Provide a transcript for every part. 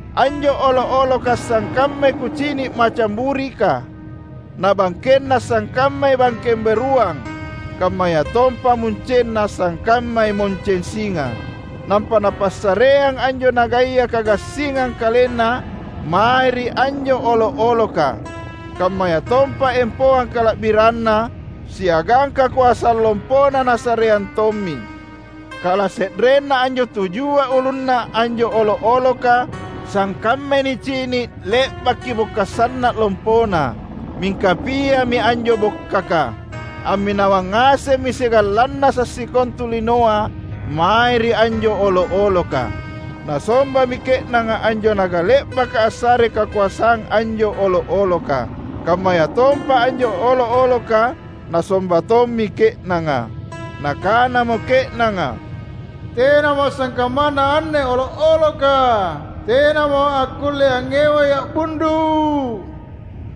Anjo olo’-oloka sangkammai kucini’ macang burika, na bangkenna sangkammai bangkeng beruang, kammayatompa muncenna sangkammai munceng singa. Nampa napassareang anjo nagaya kagassingang kalenna mae ri anjo olo’-oloka; kammayatompa empoang kala’biranna siagang kakoasang lompona nasareang tommi. Kalase’renna anjo tujua ulunna anjo olo’-oloka sangkammai nicini’ le’baki bokka’ sanna’ lompona, mingka piami anjo bokkaka. Amminawang ngasemmi siagang lannasa’ sikontu linoa mae ri anjo olo’-oloka. Nasombami ke’nanga anjo naga le’baka assarei kakoasang anjo olo’-oloka. Kammayatompa anjo olo’-oloka nasomba tommi ke’nanga. Nakanamo ke’nanga, "Tenamo sangkammanna anne olo’-oloka! Tenamo akkulle angngewai a’bundu’."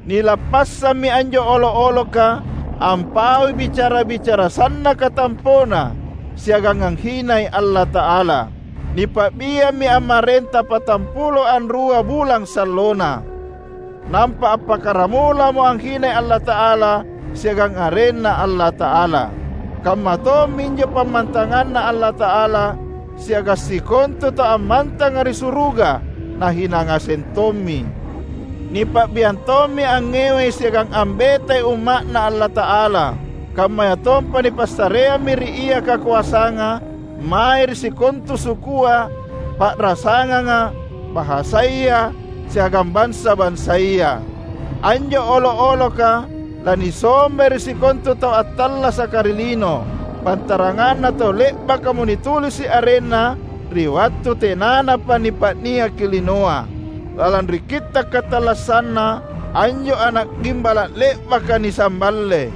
Nilappassammi anjo olo’-oloka ampaui bicara-bicara sannaka tampona siagang anghinai Allata’ala. Nipa’biammi ammarenta patampulo anrua bulang sallona. Nampa appakkaramulamo anghinai Allata’ala siagang arenNa Allata’ala. Kamma tomminjo pammantanganNa Allata’ala siagang sikontu tau ammantanga ri suruga nahina ngaseng tommi. Nipa’biang tommi angngewai siagang ambetai Umma’Na Allata’ala. Kammayatompa nipassareammi ri ia kakoasanga mae ri sikontu sukua, pa’rasanganga, bahasaya, siagang bansa-bansaya. Anjo olo’-oloka lanisombai ri sikontu tau attallasaka ri lino, pantaranganna tau le’bakamo nitulisi’ arenna ri wattu tenanapa nipa’niaki linoa, lalang ri kitta’ katallassanNa anjo Ana’ Gimbala’ le’baka nisamballe.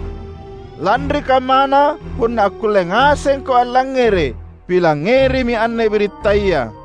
Lanri kammana, punna akkulle ngasengko allangngere’, pilangngerimi anne birittaya: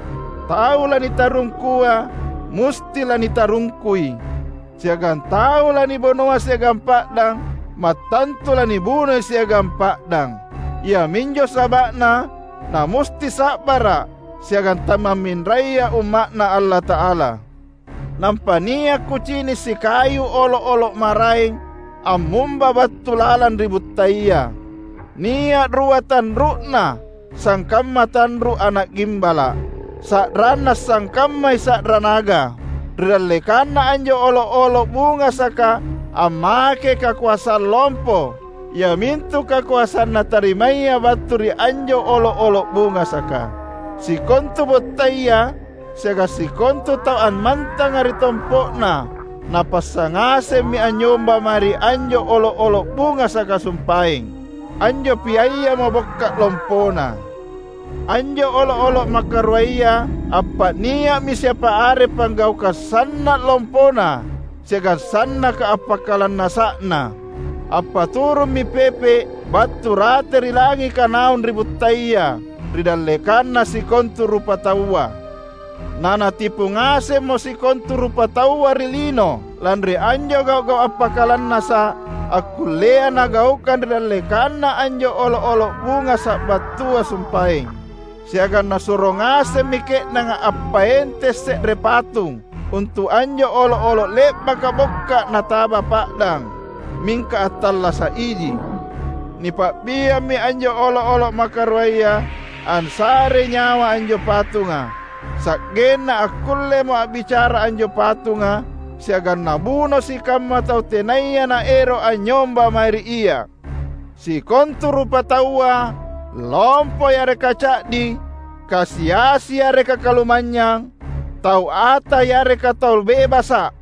"Tau lanitarungkua, musti lanitarungkui. Siagang tau lanibunoa siagang pa’dang mattantu lanibunoi siagang pa’dang. Iaminjo saba’na namusti sa’bara’ siagang tamamminraya Umma’Na Allata’ala." Nampa nia’ kucini’ sikayu olo’-olo’ maraeng ammumba battu lalang ri buttaya. Nia’ rua tanru’na sangkamma tanru’ ana’ gimbala’. Sa’ranna sangkammai sa’ra naga. Ri dallekanna anjo olo’-olo’ bungasaka ammakei kakoasang lompo iamintu kakoasang natarimaya battu ri anjo olo’-olo’ bungasaka. Sikontu buttaya siagang sikontu tau ammantanga ri tompo’na napassa ngasemmi anynyomba mae ri anjo olo’-olo’ bungasaka sumpaeng, anjo piayamo bokka’ lompona. Anjo olo’-olo’ makaruaya appa’nia’mi siapa are panggaukang sanna’ lompona siagang sannaka appakalannasa’na. Appaturummi pepe’ battu rate ri langika naung ri buttaya, ri dallekanna sikontu rupataua. Na natipu ngasemmo sikontu rupataua ri lino lanri anjo gau’-gau’ appakalannasa’ akkullea nagaukang ri dallekanna anjo olo’-olo’ bungasa’ battua sumpaeng. Siagang nasuro ngasemmi ke’nanga appaenteng se’re patung untu’ anjo olo’-olo’ le’baka bokka’ nataba pa’dang, mingka attallasa’ iji. Nipa’biammi anjo olo’-olo’ makaruaya ansarei nyawa anjo patunga, sa’genna akkullemo a’bicara anjo patunga siagang nabuno sikamma tau tenaya naero’ anynyomba mae ri ia. Sikontu rupataua, lompo yareka ca’di, kasi-asi yareka kalumanynyang, tau ata yareka tau bebasa’,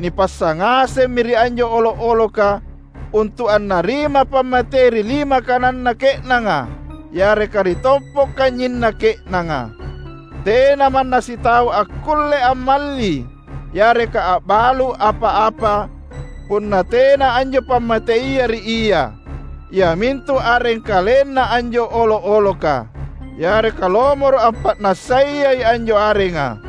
nipassa ngasemmi ri anjo olo’-oloka untu’ annarima pammatei ri lima kananna ke’nanga yareka ri tompo’ kanynyinna ke’nanga. Tena manna sitau akkulle ammalli yareka a’balu’ apa-apa punna tena anjo pammateia ri ia, iamintu areng kalenna anjo olo’-oloka, yareka lomoro’ ampa’nassayai anjo arenga.